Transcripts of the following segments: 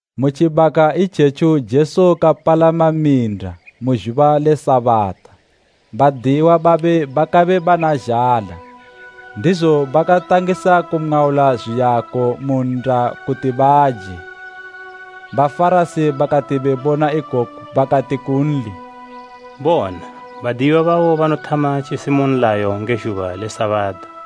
Mu tjibaka itjetjo Jesu kapalama minda mu zhuba le Sabata. Badiyiwa babe bakabe bana zhala ndizo bakatangisa kumwaula zwiyako mu nnda kuti baje. Bafarasi bakati bebona ikoku bakati kunli, “Bona! Badiyiwa babo banothama tjisimu nlayo nge zhuba le Sabata.”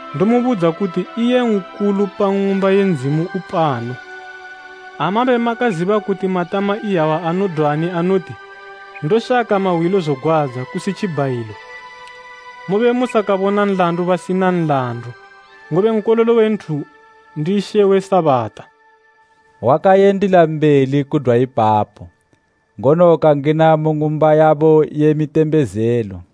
Ndomubudza kuti iye nkulu pa Ng'umba ye Ndzimu upano. Ha mabe makaziba kuti matama iyawa anodwani anoti, ‘Ndoshaka mahwilo zogwadza, kusi tjibhayilo,’ mobe musakabona nlandu basina nlandu. Ngobe Nkololo we Nthu ndi She we Sabata.” Wakayendila mbeli kudwa ipapo, ngono kangina mu ng'umba yabo ye mitembezelo.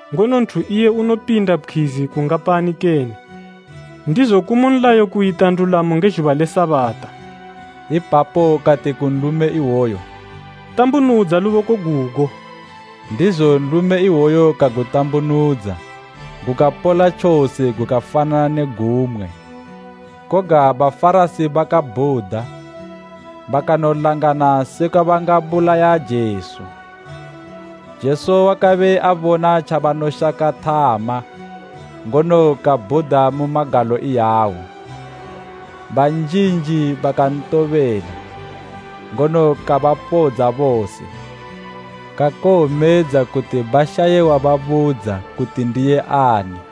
Ngono nthu iye unopinda pkhwizi kungapani kene! Ndizo kumu nlayo kuyita ndulamo nge zhuba le Sabata.” Ipapo kati ku nlume iwoyo, “Tambunudza luboko gugo.” Ndizo nlume iwoyo kagutambunudza gukapola tjose gukafanana ne gumwe. Koga Bafarasi bakabhuda bakanolangana sekwa bangabulaya Jesu. Jesu wakabe abona tjabanoshaka thama ngono, kabhuda mu magalo iyawo. Banjinji bakantobela, ngono kabapodza bose, kakowomedza kuti bashaye wababudza kuti ndiye ani.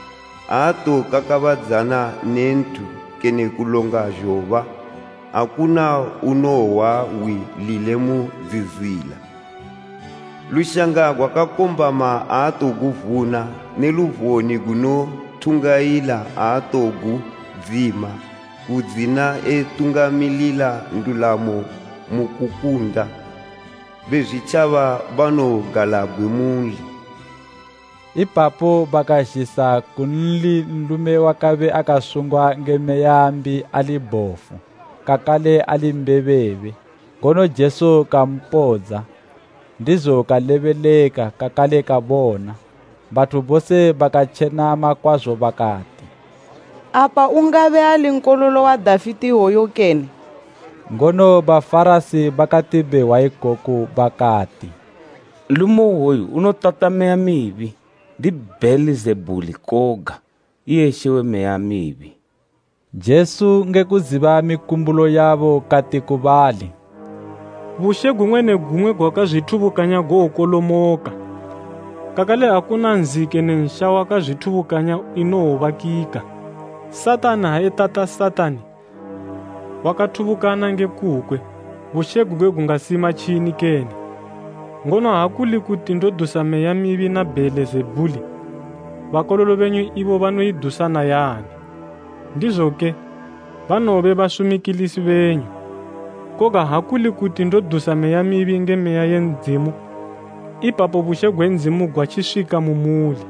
Aatokakabadzana ne nthu kene kulonga zhoba, akuna unowohwa hwi lile mu dzizila. Lushanga gwakakombama aatoguvuna, ne luvone gunothungayila aatowogudzima, kudzina etungamilila ndulamo mu kukunda. Bezwitjaba banowogalabgwe munli.” Ipapo bakazhisa kunli nlume wakabe akasungwa nge meya mbi ali bhofu kakale ali mbebebe, ngono Jesu kampodza, ndizo kalebeleka kakale kabona. Bathu bose bakatjenama kwazo bakati, “Apa ungabe ali Nkololo wa Dafite iwoyu kene?” Ngono Bafarasi bakati behwa ikoku bakati, “Nlume iwoyu unotata meya mibi ndi Bheelizebhuli koga, iye she we meya mibi.” Jesu ngekuziba mikumbulo yabo kati ku bali, “Bushe gumwe ne gumwe gwakazwithubukanya gowokolomoka, kakale akuna nzi kene nsha wakazwithubukanya inowobakika. Satani ha etata Satani, wakathubukana nge kukwe, bushe gugwe gungasima tjini kene? Ngono ha kuli kuti ndodusa meya mibi na Bheelizebhuli, bakololo benyu ibo banoidusa nayani? Ndizoke, banowobe basumikilisi benyu. Koga ha kuli kuti ndodusa meya mibi nge Meya ye Ndzimu, ipapo bushe gwe Ndzimu gwatjiswika mu muli.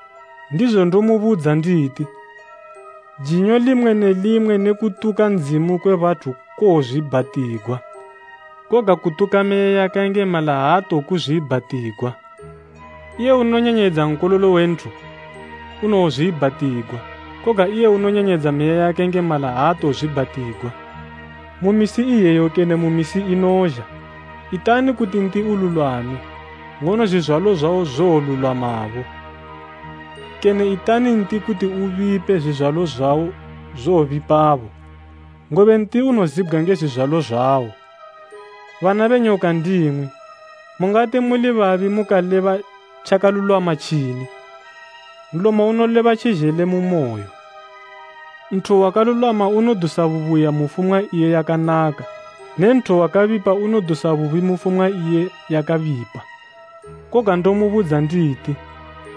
Ndizo ndomubudza nditi, jinyo limwe ne limwe ne kutuka Ndzimu kwe bathu kowozwiibhatigwa, koga kutuka Meya yakayengemala aatokuzwiibhatigwa. Iye unonyanyayidza Nkololo we Nthu, unowozwiibhatigwa, koga iye unonyanyayidza Meya yakayengemala aatowozwiibhatigwa, mu misi iyeyo kene mu misi inozha. “Itani kuti nti ululwame, ngono zwizwalo zwawo zowolulwamabo, kene itani nti kuti ubipe zwizwalo zwawo zwobipabo, ngobe nti unozibgwa nge zwizwalo zwawo. Bana be nyoka ndimwi! Mungati muli babi mukaleba tjakalulwama tjini? Nlomo unoleba tjizhele mu moyo. Nthu wakalulwama unodusa bubuya mu fumwa iye yakanaka ne nthu wakabipa unodusa bubi mu fumwa iye yakabipa. “Koga ndomubudza nditi,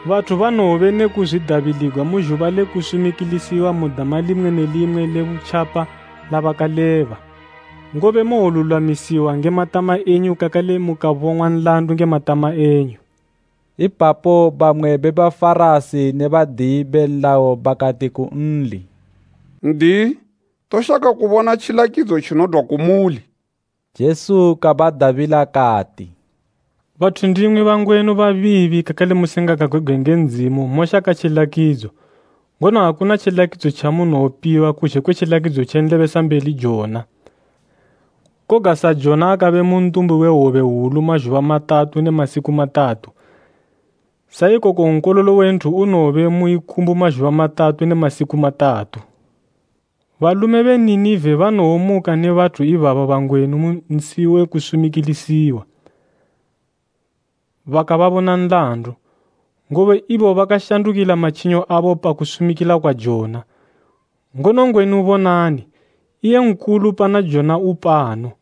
bathu banowobe ne kuzwidabiligwa mu zhuba le kusumikilisiwa mu dama limwe ne limwe le butjapa labakaleba. Ngobe mowolulwamisiwa nge matama enyu kakale mukabong'wa nlandu nge matama enyu.” Ipapo bamwe be Bafarasi ne badiyi be nlayo bakati kunli, “N'diyi, toshaka kubona tjilakidzo tjinodwa kumuli.” Jesu kabadabila kati, “Bathu ndimwi bangwenu babiibi kakale musingagagwebgwe nge Ndzimu moshaka tjilakidzo, ngono akuna tjilakidzo tjamunowopiwa kuzhe kwe tjilakidzo tje nlebesambeli Jona. Koga sa Jona akabe mu ntumbu we hwobe hwulu mazhuba matatu ne masiku matatu, sa ikoko Nkololo we Nthu unowobe mu ikumbu mazhuba matatu ne masiku matatu. Balume be Ninive banowomuka ne bathu ibaba bangwenu mu nsi we kusumikilisiwa, bakababona nlandu, ngobe ibo bakashandukila matjinyo abo pa kusumikila kwa Jona, ngono ngwenu bonani, iye nkulu pana Jona upano.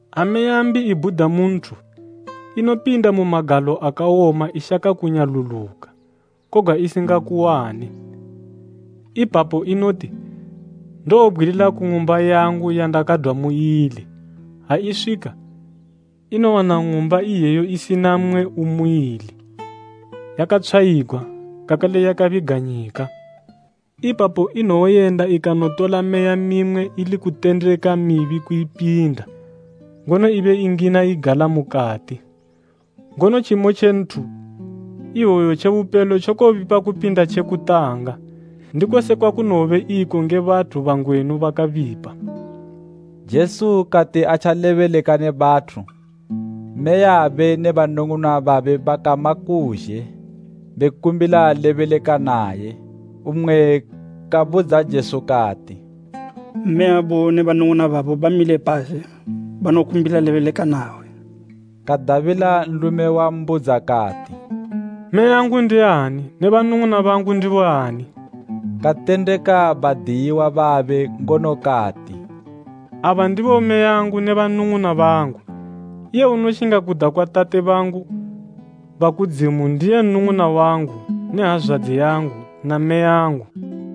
“Ha meya mbi ibhuda mu nthu, inopinda mu magalo akawoma ishaka kunyaluluka, koga isingakuwane. Ipapo unoti, ‘Ndowobgwilila ku ng'umba yangu yandakadwa muili.’ Ha iswika, inowana ng'umba iyeyo isina mmwe umuili, yakatshwayigwa, kakale yakabiganyika. Ipapo inowoyenda ikanotola meya mimwe ili kutendeka mibi kuupinda, ngono ibe ingina igala mukati. Ngono tjimo tje nthu iwoyo tje bupelo tjokobipa kupinda tje kutanga. Ndiko sekwa kunowobe iko nge bathu bangwenu bakabipa.” Jesu kati atjalebeleka ne bathu, mmeyabe ne banung'una babe bakama kuzhe, bekumbila lebeleka naye. Mmwe kabudza Jesu kati, “Mmeyabo ne banung'una babo bamile pazhe banokumbila lebeleka nawe.” Kadabila nlume wambudza kati, “Mmeyangu ndiani ne banung'una bangu ndiboani?” Katendeka badiyiwa babe ngono kati, “Aba ndibo mmeyangu ne banung'una bangu. Iye unoshinga kuda kwa Tate bangu ba kudzimu ndiye nnung'una wangu ne hazwadzi yangu na mmeyangu.”